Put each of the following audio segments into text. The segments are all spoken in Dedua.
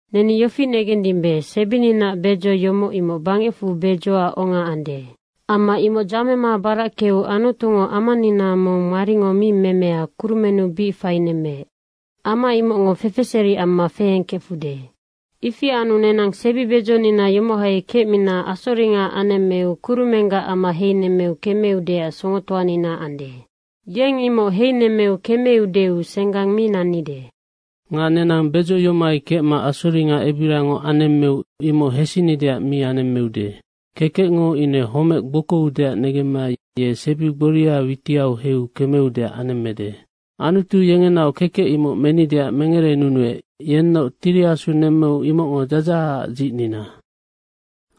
Neni yofi negendimbe, sebininaac bedzo yomoc, imoc bangecfu bedzoac onga ande. Amma imoc dzamema barackeu Anutungo amanina mong maringo mi memea kurumennu bic fainemmeec. Ama imocngo fefeseri amma feengkefude. Ifi anu, nenang sebibedzonina yomohai kecmina asoringa anemmeu kurumenggac ama heinemmeu kemeudeac songotoanina ande. Yeng imoc heinemmeu kemeudeu senggang mi nannide. Nga nenang bedzo yomohai kecma asoringa ebirangoc anemmeu imoc hesinideac mi anemmeude. Kekecngo ine homec gbokoudeac negemma ye sebi gboria witiau heiu kemeudeac anemmede. Anutu yengenaoc kekec imoc menideac mengerenunuec, yennoc Tiri Asu nemmeu imocngo dzadzahacac dzicnina.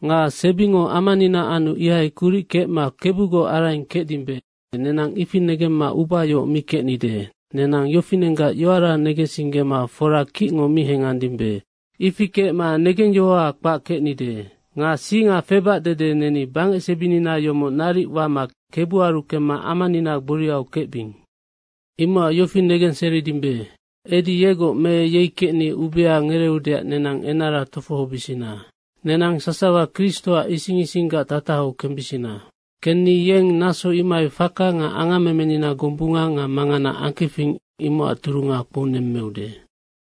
Nga sebingo amanina anu ihai kuric kecma Kebugoc araing kecdimbe, nenang ifi negemma ubayohoc mi kecnide. Nenang yofinenggac yoara negensinggema fora kicngo mi hengandimbe. Ifi kecma negengyohoha kpac kecnide. Nga singa febac dede neni bangecsebinina yomoc naric wama Kebuaru kemma amanina gboriau kecbing. Imocac yofi negenseridimbe, edi yegoc me yei kecni ubea ngereeudeac nenang enara tofohobisina. Nenang sasawa Kristoac ising isinggac tatahau kembisina. Kenni yeng naso imohai faka nga angammemenina gombunga nga mangana angkefing, imocac turunga kpounemmeude.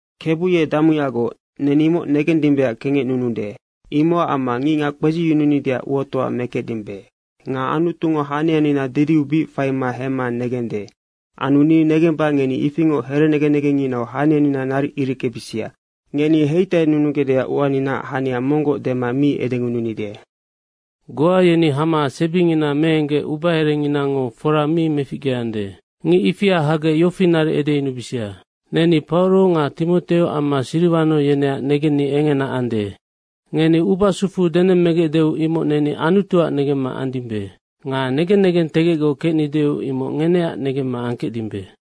Kebu ye damuyagoc, neni imoc negendimbeac kengecnunude. Imocac amma ngicngac kpedziyununideac uatoa mekecdimbe. Nga Anutungo hanianina didiu bic faima hemma negende. Anu ni negemba ngeni ifingoc here negen negengnginau hanianina naric ireckebisia. Ngeni heitainunugecdeac uaninaac hania monggoc dema mi edengununide. Goa yeni hama sebingina meenggec ubaherenginango fora mi meficgeande. Ngic ifia hagec yofi naric edeyunubisia, “Neni Pauro nga Timoteo amma Siriwano yeneac negenni engena ande.” Ngeni ubasufu denemmegecdeu imoc neni Anutuac negemma andimbe. Nga negen negentegecgoc kecnideu imoc ngeneac negemma angkecdimbe.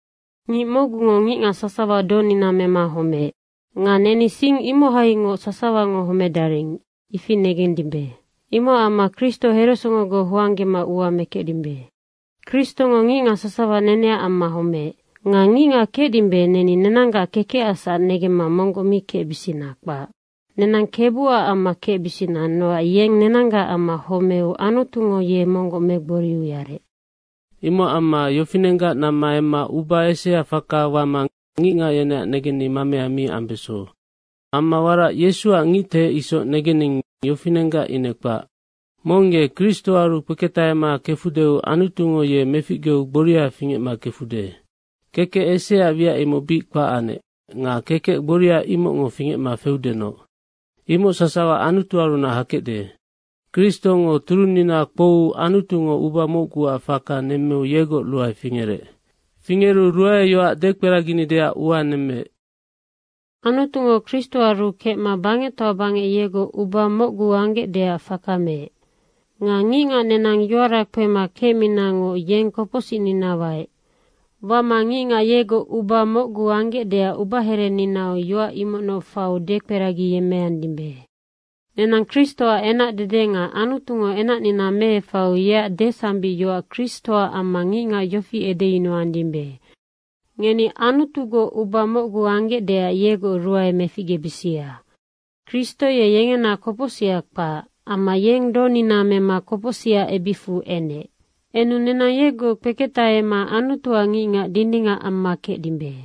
Ngic mocgungo ngicngac sasawa donina mema homeec. Nga neni sing imohaingoc sasawango homedaring, ifi negendimbe. Imocac amma Kristo heresongogoc hoanggema ua mekecdimbe. Kristongo ngicngac sasawa neneac amma homeec. Nga ngicngac kecdimbe, neni nenanggac kekecacsac negemma monggoc mi kecbisina, kpac. Nenang Kebuac amma kecbisina, nocac yeng nenanggac amma homeu Anutungo ye monggoc megboriu yarec. Imocac amma yofinenggac namma emma uba esea faka wama ngicngac yeneac negenni mamea mi ambeso. Amma warac Yesuac ngictehec isoc negening, yofinenggac ine kpac. Mong ye Kristoaru kpeketahama kefudeu Anutungo ye meficgeu gboria fingecma kefude. Kekec eseaac wiac imoc bic kpac anec nga kekec gboria imocngo fingecma feudenoc. Imoc sasawa Anutuarunac hakecde. Kristongo turunnina kpouu Anutungo uba mocguac faka nemmeu yegoc ruae fingerec. Fingeru ruaeyoac dekperaginideac ua nemmeec. Anutungo Kristoaru kecma bangectoa bangec yegoc uba mocgu anggecdeac faka meec. Nga ngicngac nenang yoara kpema kecminangoc yeng kopocsicnina waec. Wama ngicngac yegoc uba mocgu anggecdeac ubahereninau yoac imocnoc faiu dekperagiyemmeandimbe. Nenang Kristoac enacdede nga Anutungo enacnina meefaiu yeac desambicyoac Kristoac amma ngicngac yofi edeyunuandimbe, “Ngeni Anutugoc uba mocgu anggecdeac yegoc ruae meficgebisia.” Kristo ye yengena kopocsiha kpac. Amma yeng donina mema kopocsicac ebicfu enec. Enu nenang yegoc kpeketahema Anutuac ngicngac dindingac amma kecdimbe.